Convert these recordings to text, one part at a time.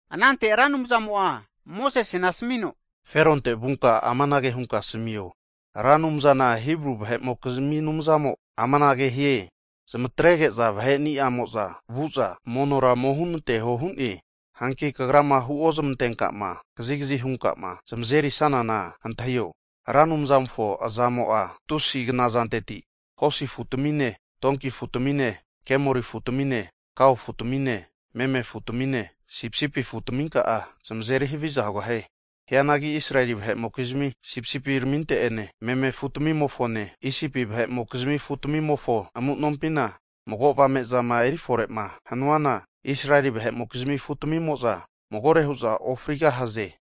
Anante Ra Anumzamo'a Mosesena asmino, Feronte vunka amanage hunka ome asamio, Ra Anumzana Hibru vahe'mokizmi Anumzamo amanage hie, zmatrege'za vahe'niamo'za vu'za, monora ome hunanteho hu'ne. Hagi kagrama huo zmantenkama kazigazi hunkama zamazeri sanana, antahi'o, Ra Anumzamofo aza'mo'a tusi knazanteti, hosi afu'tamine tonki afu'tamine, kemori afu'tamine kao afu'tamine meme afu'tamine sipisipi afu'tminka'a zamazeri havi'za hugahie. Hianagi Israeli vahe'mokizmi sipisipiraminte'ene meme afutmimofone, Isipi vahe'mokizmi afutamimofo amu'nompina mago avame'zama eri fore'ma hanuana, Israeli vahe'mokizmi afu tamimo'za magore hu'za ofrigahaze.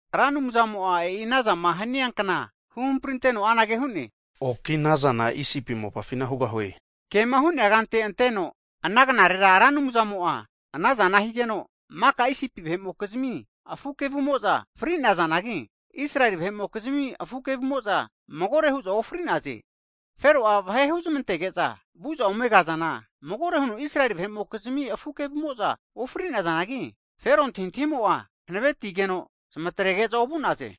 Ra Anumzamo'a e'i ana zama hania kna huhamprinteno anage hu'ne, oki ana zana Isipi mopafina hugahue. Kema hu'nea kante, anteno, ana knarera Ra Anumzamo'a anazana higeno, maka Isipi vahe'mokizmi afu kevumo'za fri'nazanagi, Israeli vahe'mokizmi afu kevumo'za magore hu'za ofri'naze. Fero'a vahe'a huzmantege'za vu'za ome kazana, magore huno Israeli vahe'mokizmi afu kevumo'za ofri'nazanagi, Fero antahintahimo'a hanavetigeno zmatrege'za ovu'naze.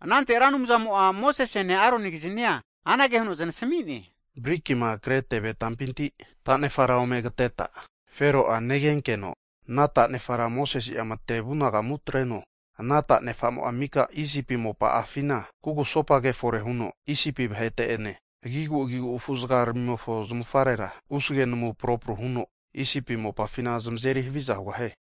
Anante Ra Anumzamo'a Mosesene Aronigiznia anage huno znasmi'ne, Brikima kre teve tampinti tanefara ome kateta, Fero'a negenkeno ana tanefara Mosese'a matevu nagamu atreno. Ana tanefamo'a mika Isipi mopa'afina kugusopage fore huno, Isipi vahete'ene agigu'agigu afu'zagamofo zmavufarera usge namu propru huno Isipi mopafina zamazeri haviza hugahie.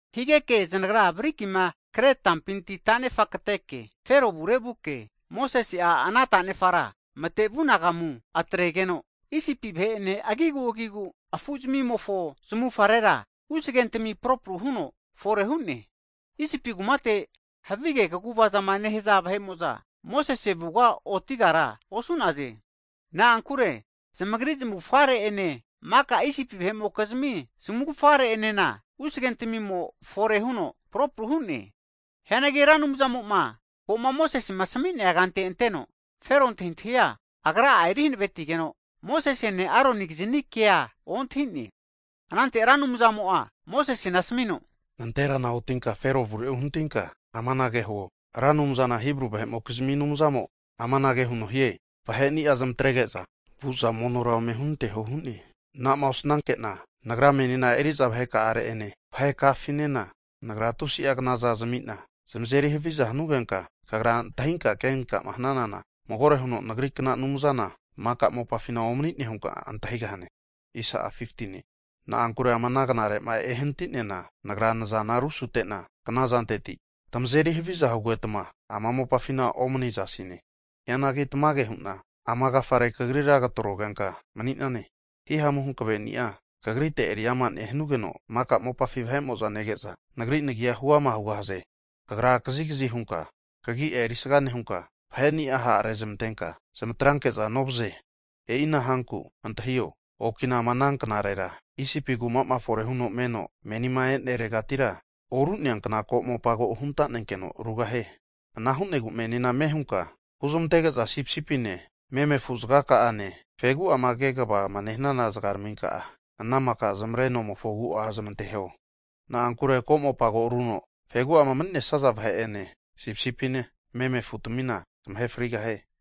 Higeke zanagra brikima kre tampinti tanefa kateke, Fero avure vuke, Mosese'a ana tanefara matevu anagamu atregeno, Isipi vahe'ene agigu'agigu afuzmimofo zmufarera usage namuntami propru huno fore hu'ne. Isipi kumate havige kaguvazama nehaza vahe'mo'za Mosese avuga otigara osu'naze. Na'ankure zamagri zmavufgare'ene, maka Isipi vahe'mokizmi zmavufgare'enena usagentmi fore huno propru hu'ne Hianagi Ra Anumzamo'ma ko'ma Mosesema asmi'nea kante anteno, Fero antahintahia Agra'a eri hanavetigeno, Mosesene Aroni'gizni kea ontahi'ne. Anante Ra Anumzamo'a Mosesena asmino, Nanterame otinka Fero avure uhanatinka amanage huo, Ra Anumzana Hibru vahe'mokizmi Anumzamo amanage huno hie, vahe'nia zmatrege'za vu'za monora ome hunanteho hu'ne. Anama osnanke'na Nagra menina eri'za vaheka'are'ene, vahekafinena, Nagra tusi'a knaza zami'na zamazeri haviza hanugenka, kagra antahinka kenkama hananana magore huno Nagri kna anumzana, maka mopafina omani'ne hunka antahigahane. Na'ankure ama knare'ma ehanatiana Nagra nazana rusute'na knazanteti tmazeri havizana hugetma ama mopafina omanizasine. Hianagi tamage hu'na ama agafare kagrira katrogenka mani'nane, hihamu hankveni'a kagrite eri'ama nehanugeno, maka mopafi vahe'mo'za nege'za Nagri Nagi'a huama hugahaze. Kagra kazikzi hunka kagi'a erisga nehunka, vahe'ni'a ha' rezmantenka zmatranke'za novaze. E'ina hanku antahio, okina ama ana knarera, Isipi kuma'ma fore huno meno menima e'neregatira oru'nea kna ko'mopa ko hunta'nenkeno rugahie. Ana hu'negu menina ame hunka huzmantege'za sipisipine meme afu zagaka'ane fegu'ama kegavama nehanana zagaraminka'a ana maka zmavre nomofo agu'a zmanteho, na'ankure ko'mopa ko aruno fegu'ama mani'nesnaza vahe'ene sipisipine meme afutamina zamahe frigahie.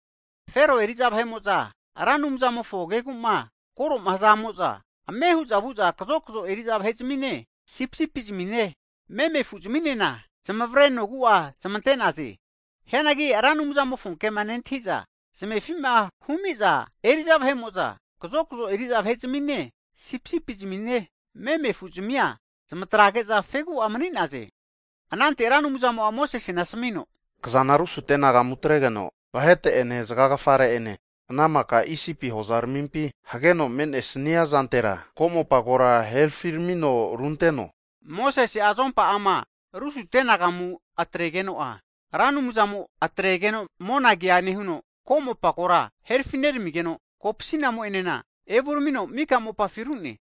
Fero eri'za vahe'mo'za Ra Anumzamofo kegu'ma kore'ma hzamo'za, ame hu'za vu'za kazokzo eri'za vahe'zmine, sipisipine meme afu zminena zmavre nogu'a zmante'naze. Hianagi Ra Anumzamofo kema nentahi'za zmefi'ma humi'za eri'za vahe'mo'za kazokzo eri'za vahe'zmine sipisipine meme afu'zmia zmatrage'za fegu'a mani'naze. Anante Ra Anumzamo'a Mosesena asmino, Kazana rusute anagamu atregeno, vahete'ene zagagafare ene, ana maka Isipi hozaramipi hageno mane'nesnia zantera ko'mopa kora herafiramino runteno. Mosese'a azompa'ama rusute nagamu atregeno'a, Ra Anumzamo atregeno monagea nehuno, ko'mopa kora herfineramigeno, kopsinamo'enena evuramino mika mopafina ru'ne.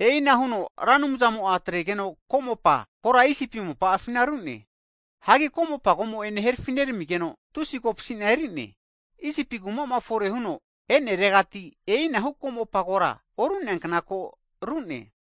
E'ina huno Ra Anumzamo'a atregeno ko'mopa kora Isipi mopa'afina ru'ne. Hagi Ko'mopa komo'ene herfi'neramigeno tusi kopsina eri'ne. Isipi kuma'ma fore huno e'neretira e'inahu ko'mopa kora oru'neankna ko ru'ne.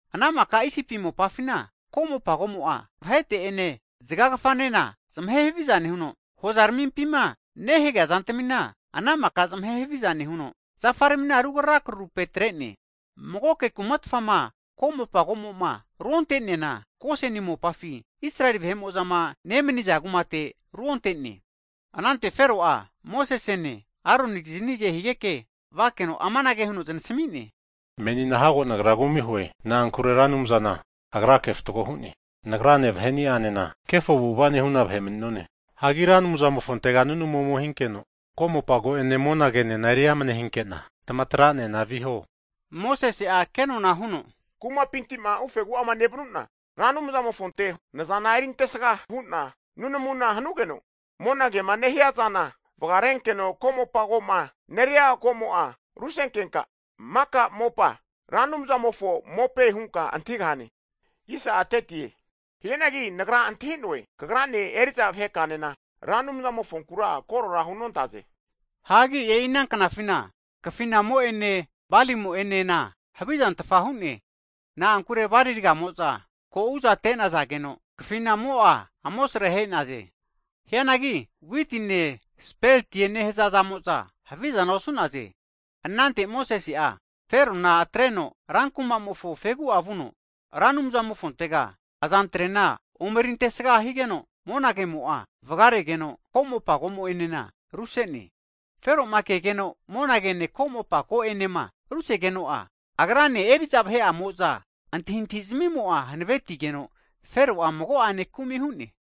Ana maka Isipi mopa'afina ko'mopa komo'a, vahete ene zagagafanena, zamahe haviza nehuno, hozaramimpima nehagea zantamina, ana maka zamahe haviza nehuno zafaramina rukrara krarupe atre'ne. Magoke kumatfama ko'mopa ko'mo'ma ruonte'neana, Goseni mopafi Israeli vahe'mo'zama nemaniza kumate ruonte'ne. Anante Fero'a Mosesene Aronikizni ke higeke vakeno amanage huno znasmi'ne, Menina hago nagra kumi hu'noe. Na'ankure Ra Anumzana Agrake fatgo hu'ne. Nagrane vahe'nianena kefo avu'ava nehuna vahe mani'none. Hagi Ra Anumzamofontega nunamu ome hikeno, ko'mopa ko'ene monagenena eri amane hinke'na tamatra'nena viho. Mosese'a kenona huno, Kumapinti'ma ufegu'ama nevanu'na Ra Anumzamofonte nazana erintesaga hu'na nunamuna hanugeno, monagema nehiazana vagarenkeno ko'mopago'ma neria ko'mo'a rusenkenka, maka mopa Ra Anumzamofo mope hunka antahigahane. Hianagi nagra antahinoe, kagrane eri'za vahe ka'anena Ra Anumzamofonkura korora hunontaze. Hagi e'i ana knafina (flax) kafinamo'ene balimo'enena, havizantfa hu'ne. Na'ankure bali ragamo'za ko' uzate'nazageno kafinamo'a amosre ahe'naze. Hianagi witine speltie nehaza zamo'za havizana osu'naze. Anante Mosese'a Ferona atreno ra kumamofo fegu'a vuno, Ra Anumzamofontega azantrena omeri antesga higeno, monagemo'a vagaregeno, ko'mopa komo'enena ruse'ne. Fero'ma kegeno monagene ko'mopa ko'enema rusegeno'a, Agrane eri'za vahe'amo'za antahintahizmimo'a hanavetigeno Fero'a mago'ane kumi hu'ne.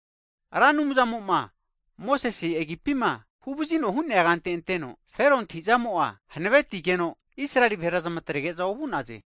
Ra Anumzamo'ma Mosese agipima huvazino hu'nea kante anteno, Fero antahi'zamo'a hanavetigeno Israeli vahera zmatrege'za ovu'naze.